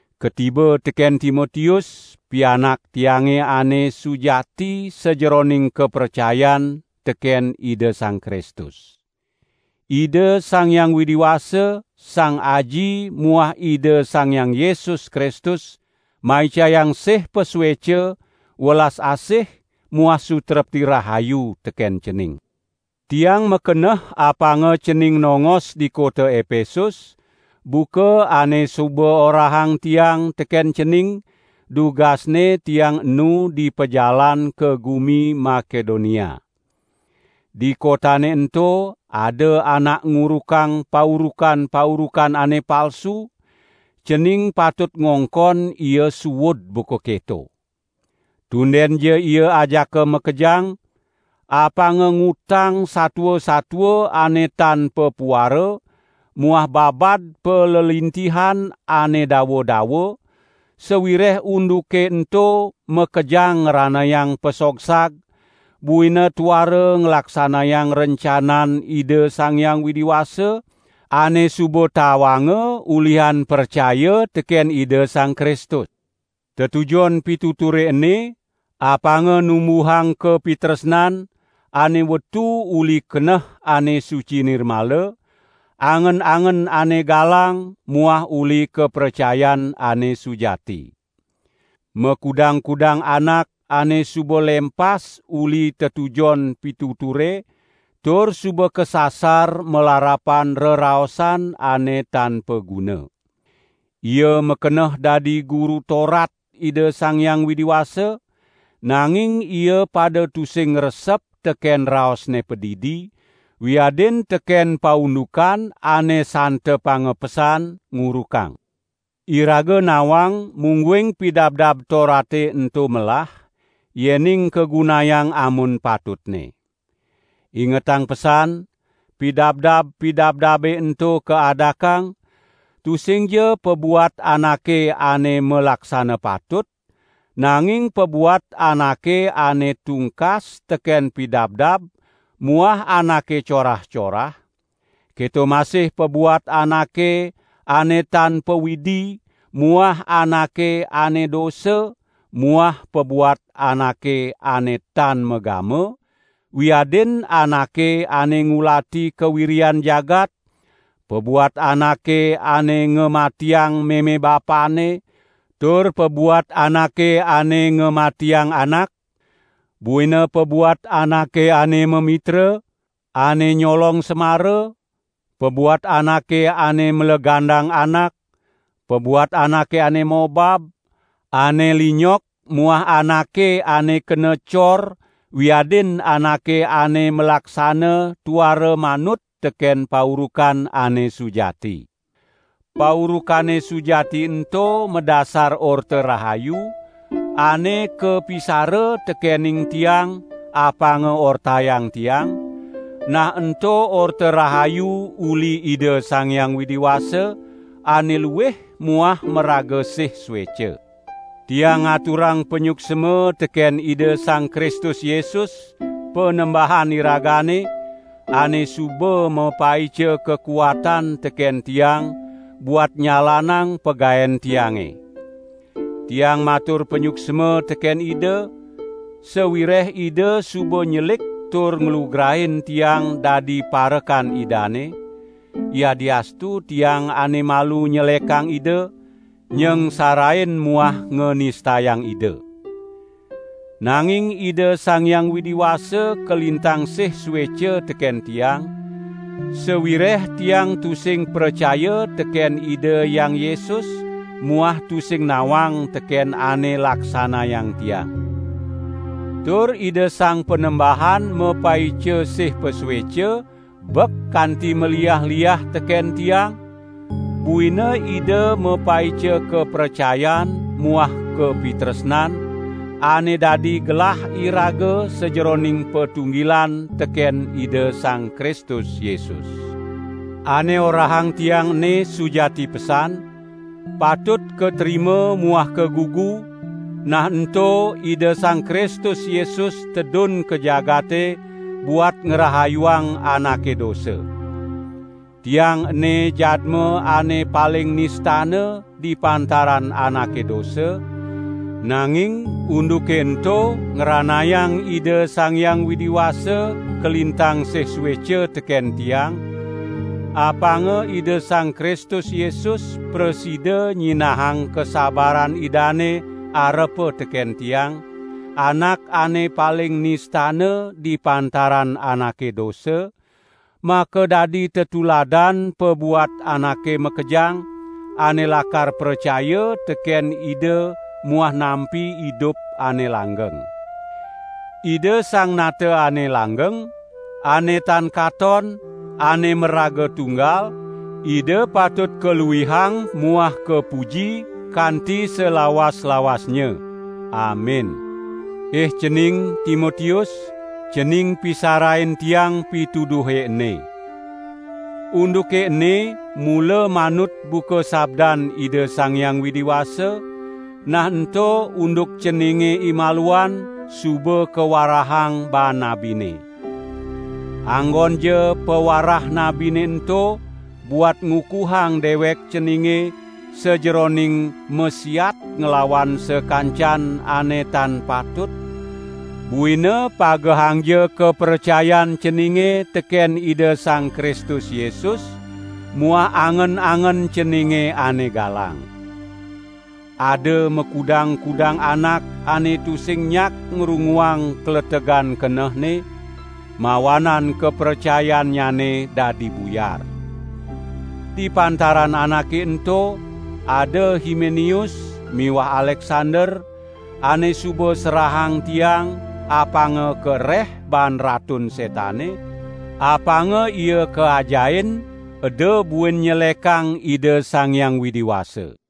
Katiba teken Timotius, pianak tiange ane sujati sajeroning kapracayan teken Ida Sang Kristus. Ida Sang Hyang Widi Wasa, Sang Aji muah Ida Sang Hyang Yesus Kristus maicayang sih pasueca, welas asih muah sutrepti rahayu teken cening. Tiang makeneh apanga cening nongos di kota Epesus, buka ane suba orahang tiang teken cening dugasne tiang enu di pajalan ka gumi Makedonia. Di kotane ento ada anak ngurukang paurukan-paurukan ane palsu, cening patut ngongkon ia suud buka keto. Tundenja ia ajaka makejang, apanga ngutang satua-satua ane tan papuara muah babad palelintihan ane dawa-dawa, sawireh unduke ento makejang ngranayang pasogsag, buina tuara nglaksanayang rencanan Ida Sang Hyang Widi Wasa, ane suba tawanga ulihan pracaya teken Ida Sang Kristus. Tetujon pituture ene, apanga numbuhang kapitresnan, ane wetu uli keneh ane suci nirmala, angen-angen ane galang muah uli kapracayan ane sujati. Makudang-kudang anak ane suba lempas uli tetujon pituture tur suba kasasar malarapan reraosan ane tan paguna. Ia makeneh dadi guru Torat Ida Sang Hyang Widi Wasa nanging ia pada tusing ngresep teken raosne padidi, wiadin teken paundukan ane santepanga pesan ngurukang. Iraga nawang mungguing Pidabdab Torate ento melah, yening kagunayang amun patutne. Ingetang pesan, pidabdab-pidabdabe ento kaadakang, tusingja pabuat anake ane malaksana patut, nanging pabuat anake ane tungkas teken pidabdab muah anake corah-corah; keto masih pabuat anake ane tan pawidi muah anake ane dosa muah pabuat anake ane tan magama wiadin anake ane ngulati kawiryan jagat, pabuat anake ane ngamatiang meme-bapanne, tur pabuat anake ane ngamatiang anak; buina pabuat anake ane mamitra, ane nyolong semara, pabuat anake ane mlegandang anak, pabuat anake ane mobab, ane linyok muah anake ane kena cor wiadin anake ane malaksana tuara manut teken paurukan ane sujati. Paurukane sujati ento madasar Orta Rahayu, ane kapisara tekening tiang apanga ortayang tiang, nah ento Orta Rahayu uli Ida Sang Hyang Widi Wasa, ane luih muah maraga sih sueca. Tiang ngaturang panyuksma teken Ida Sang Kristus Yesus, Panembahan iragane ane suba mapaica kakuatan teken tiang buat nyalanang pagaen tiange! Tiang matur panyuksma teken Ida, sawireh Ida suba nyelik tur nglugrain tiang dadi parekan Idane, yadiastu tiang ane malu nyelekang Ida, nyangsarain muah nganistayang Ida. Nanging Ida Sang Hyang Widi Wasa kalintang sih sueca teken tiang, sawireh tiang tusing pracaya teken Ida Hyang Yesus muah tusing nawang teken ane laksanayang tiang. Tur Ida Sang Panembahan mapaica sih pasueca bek kanti maliah-liah teken tiang, buina Ida mapaica kapracayan muah kapitresnan, ane dadi gelah iraga sajeroning patunggilan teken Ida Sang Kristus Yesus. Ane orahang tiang ene sujati pesan, patut katrima muah kagugu, nah ento Ida Sang Kristus Yesus tedun ka jagate buat ngrahayuang anake dosa. Tiang ene jadma ane paling nistana di pantaran anake dosa, nanging unduke ento ngranayang Ida Sang Hyang Widi Wasa kalintang sih sueca teken tiang, apanga Ida Sang Kristus Yesus prasida nyinahang kasabaran Idane arepa teken tiang, anak ane paling nistana di pantaran anake dosa, makadadi tetuladan pabuat anake makejang, ane lakar pracaya teken Ida muah nampi idup ane langgeng. Ida Sang Nata ane langgeng, ane tan katon, ane maraga tunggal, Ida patut kaluihang muah kapuji kanti salawas-lawasnya. Amin. Ih cening, Timotius, cening pisarain tiang pituduhe ene. Unduke ene mula manut buka sabdan Ida Sang Hyang Widi Wasa, nah ento unduk ceninge imaluan suba kawarahang baan nabine. Anggonja pawarah nabine ento buat ngukuhang dewek ceninge, sajeroning masiat nglawan sakancan ane tan patut, buina pagehangja kapracayan ceninge teken Ida Sang Kristus Yesus muah angen-angen ceninge ane galang. Ada makudang-kudang anak ane tusing nyak ngrunguang kletegan kenehne, mawanan kapracayannyane dadi buyar. Di pantaran anake ento, ada Himeneus muah Aleksander, ane suba serahang tiang apanga kareh baan Ratun Setane, apanga ia kaajahin eda buin nyelekang Ida Sang Hyang Widi Wasa.